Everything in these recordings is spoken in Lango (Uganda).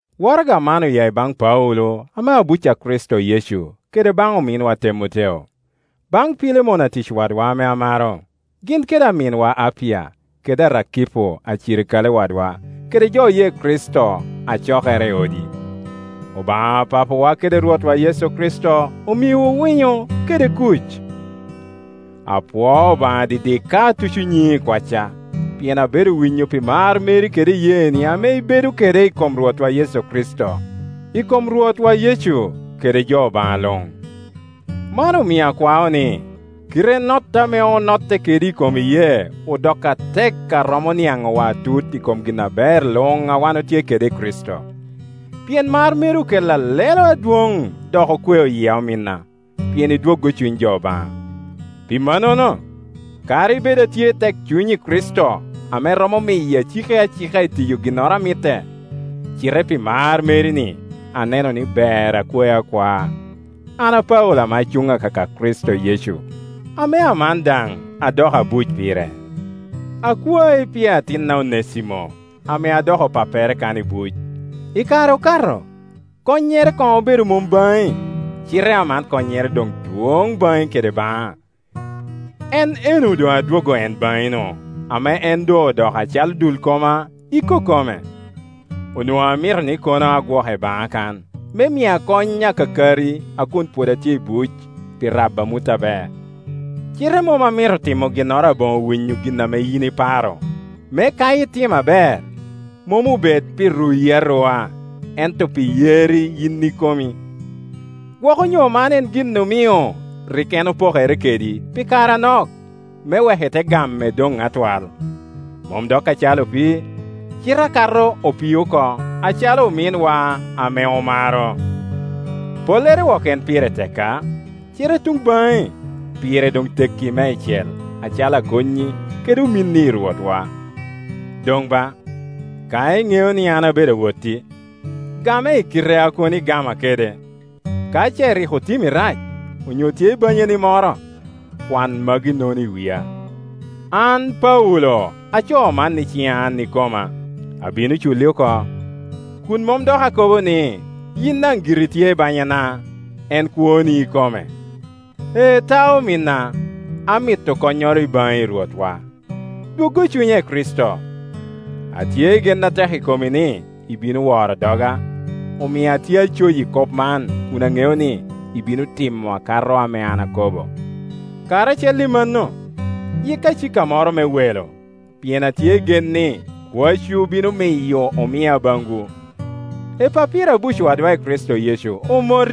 Waraga man oya i baŋ Paulo, ame abuc a Kricito Yecu, kede baŋ ominwa Temoteo. Baŋ Pilemon atic wadwa ame amaro, gin kede aminwa Apia, kede Arakipo acirikale wadwa, kede jo oye Kricito a cokere i odi: Obaŋa Papawa kede Rwotwa Yecu Kricito omiwu winyo kede kuc. Apwoo Obaŋana didik ka atuco nyiŋi i kwacca, pien abedo winyo pi mar meri kede iyeeni ame ibedo kede i kom Rwotwa Yecu kede jo Obaŋa luŋ. Man omio akwao ni, kite notte ame onotte kedi i kom iyee odok atek a romo niaŋowa atut i kom gin aber luŋ a wan otye kede i Kricito. Pien mar meri okella lelo adwoŋ dok okweo yia, omina, pien idwoggo cuny jo Obaŋa. Pi mannono, kadi bed atye i tekcuny i Kricito ame romo miyo aciki acika itiyo ginnoro a mitte, cite pi mar meri-ni aneno ni ber akwai akwaa, an Paulo ame acuŋ akaka Kricito Yecu, ame aman daŋ adoko abuc pire. Akwai pi atinna Onesimo, ame adoko pappere kan i buc. I kare okato konnyere koŋ obedo mom baŋi, cite aman konnyere doŋ dwoŋ baŋi kede baŋa. En enno doŋ adwoggo en baŋi-nu, ame en doŋ odoko acalo dul koma ikokome. Onwoŋo amito ni kono agwoke baŋa kan, me mia kony akakari a kun pwod atye i buc pi rabo amut aber; cite mom amito timo ginnoro aboŋo winyo gin a yin iparo, me ka itimma ber, mom obed pi ruyi arua, ento pi yerri yin ikomi. Gwok onyo man en gin omio rik en opokere kedi pi kare anok, me wek ite game doŋ atwal, mom dok acalo opii, cite akato opii oko, acalo ominwa ame omaro. Pollere wok en pire tekka, cite i tuŋ baŋi pire doŋ tekki meicel, acalo akonnyi kede ominni i Rwotwa. Doŋ ba, ka iŋeo ni an abedo awotti, game i kite a kono igama kede. Ka ce rik otimmi rac, onyo tye i banyani moro, kwan magi-nono i wia. An Paulo acoo man i ciŋa an ikoma, abino culli oko. Kun mom dok akobo ni, yin daŋ giri itye i banyana, en kwoni ikome. Ee ta, ominna, amito konnyoro i baŋi i Rwotwa. Dwoggo cunya i Kricito. Atye i gen atek i komi ni ibino woro doga, omio atye acoyi kop man kun aŋeo ni ibino timo akato ame an akobo. Karacel i mano, yikka icika moro me welo, pien atye i gen ni kwacwu bino miyo omia baŋwu. Epapira abuc wadwa i Kricito Yecu omoti,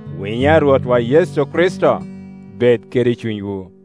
Winyo a Rwotwa Yecu Kricito bed kede cunywu.